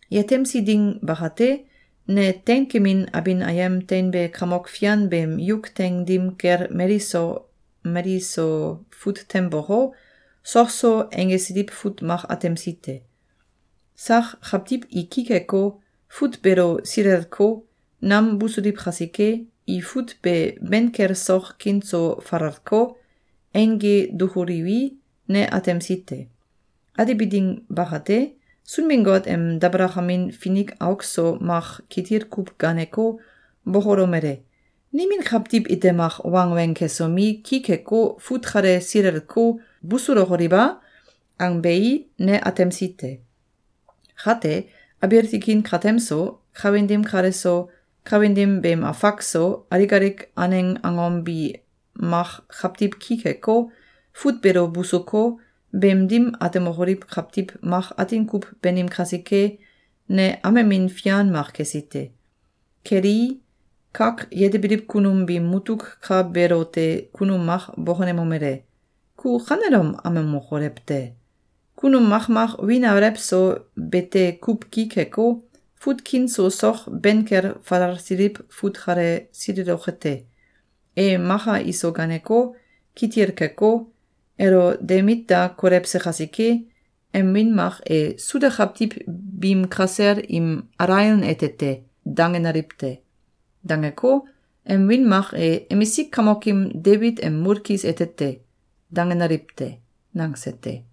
Yetemsi ding bakate, ne teinkemin abin ayem teinbe Kamok fian beem yuk teing dim kel mali so mali so fut tem boko, sok so einggesiliw fut mak atemsi te. Sak kawtiw i ki keko, fut beelo silelko, nam busuliw kasike, i fut be ben kel sok kin so falalko, eingge dukuliwi, ne atemsi te. Atebi ding bakate, Sunbin-Got em dabalakamin finik auk so mak kitil kuw gaaneko, bokolomele: “Nimin kawtiw ite mak wangweng kesomi, ki keko, fut kale silelko, busulokoliw a?”, angbei, ne atemsi te. Kate, abiil tikin katem so, kawin dim kale so, kawin dim beem afak so, alik alik aneng angom bi mak kawtiw ki keko, fut beelo busuko, beem dim atemokoliw kawtiw mak atin kuw banim kasike, ne amemin fian mak kesi te. Kelii, kak yetebiliw kunum biim mutuk ka beelote kunum mak bokonemomele: “Ku kanelom amemokolew te! Kunum makmak wiin alew so bete kuw ki keko, fut kin so sok ben kel falalsiliw fut kale sileloke te. E maka iso ganeko, kitil keko, elo de mit da kolewse kasike, em wiin mak e ‘Suda kawtiw biim kasel im alaion ete te!’, dangenaliw te. Dangeko, em wiin mak e ‘Emisik kamokim Debit em mulkis ete te!’, dangenaliw te.”, nangse te.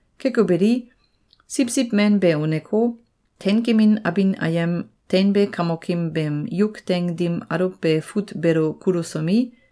Keko beli, Siwsiw Men be uneko, teinkemin abin ayem teinbe Kamokim beem yuk teing dim aluwbe fut beelo kulusomi,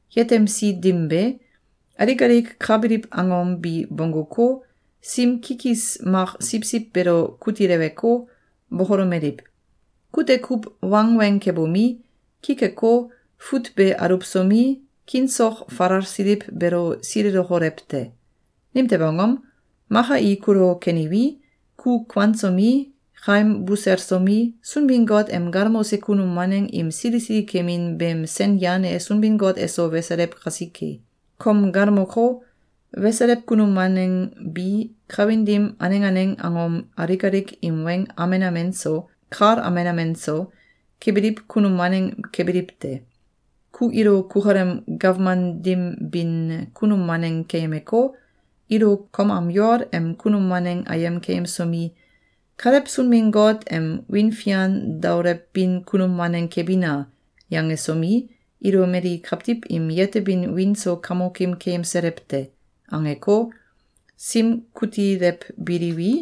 Yetemsi dim be, alik alik ka biliw angom bi bongguko, sim kikis mak siwsiw beelo kutileweko, bokolomeliw: “Kute kuw wangweng kebomi, ki keko, fut be aluwsomi, kin sok falalsiliw beelo silelokolew te! Nimtew angom? Maka i kulo keniwi, ku kuansomi, kaim buselsomi, Sunbin-Got em galmose kunum waneng im sili sili kemin beem sen yan e Sunbin-Got eso weselew kasike. Kom galmoko, weselew kunum waneng bi, kawin dim aneng aneng angom alik alik im weng amen amen so, kal amen amen so, kebiliw kunum waneng kebiliw te. Ku ilo kukalem gawman dim bin kunum waneng keyemeko, ilo kom am yol em kunum waneng ayem keyemsomi, “Kalew Sunbin-Got em wiin fian daolewbin kunum waneng kebina!”, yangesomi, ilo mali kawtiw im yetebin wiin so kamokim keyemselew te.”, angeko, sim kutilewbiliwi,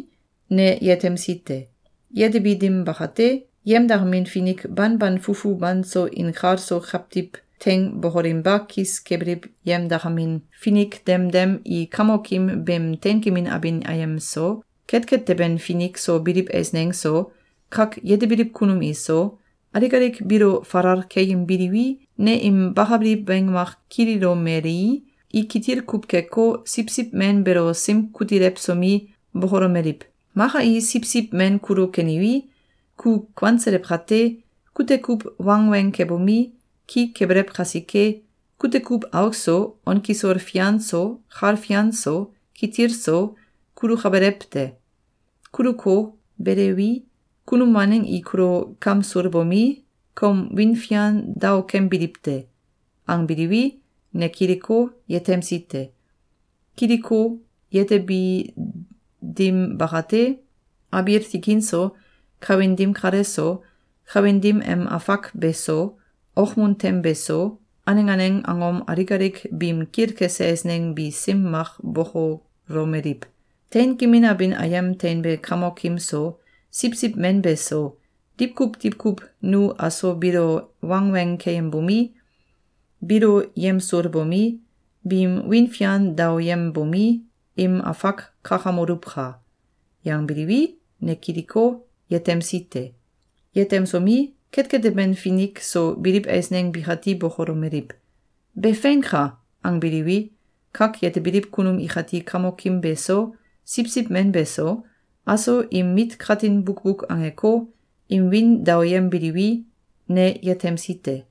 ne yetemsi te. Yetebi dim bakate, yemdakamin finik banban fufu banso inkalso kawtiw teing bokolinba kis kebiliw yemdakamin finik demdem i Kamokim beem teinkemin abin ayem so, ketket teben finik so biliw eisneng so, kak yetebiliw kunum iso, alik alik biilo falal keyembiliwi, ne im bakabiliw weng mak kililomelii, i kitil kuw keko, Siwsiw Men beelo sim kutilewsomi, bokolomeliw: “Maka i Siwsiw Men kulo keniwi, ku kuanselew kate, kute kuw wangweng kebomi, ki kebelew kasike, kute kuw auk so, on kisol fian so, kal fian so, kitil so, kulukabelew te. Kuluko, belewi, kunum waneng i kulo kamsulbomi, kom wiin fian daokembiliw te.”, angbiliwi, ne kiliko, yetemsi te. Kiliko, yetebi dim bakate, abiil tikin so, kawin dim kale so, kawin dim em afak be so, okmun tem be so, aneng aneng angom alik alik biim kilkese eisneng bi sim mak bokolomeliw: “Teinkemin abin ayem teinbe Kamokim so, Siwsiw Men beso, diwkuw diwkuw nu aso biilo wangweng keyembomi, biilo yemsulbomi, biim wiin fian daoyembomi, im afak kakamoluwka!”, yangbiliwi, ne kiliko, yetemsi te. Yetemsomi, ketket teben finik so biliw eisneng bikati bokolomeliw: “Be feinka!”, angbiliwi, kak yetebiliw kunum ikati Kamokim beso, Siwsiw Men beso, aso im mit katin bukbuk angeko, im wiin daoyembiliwi, ne yetemsi te.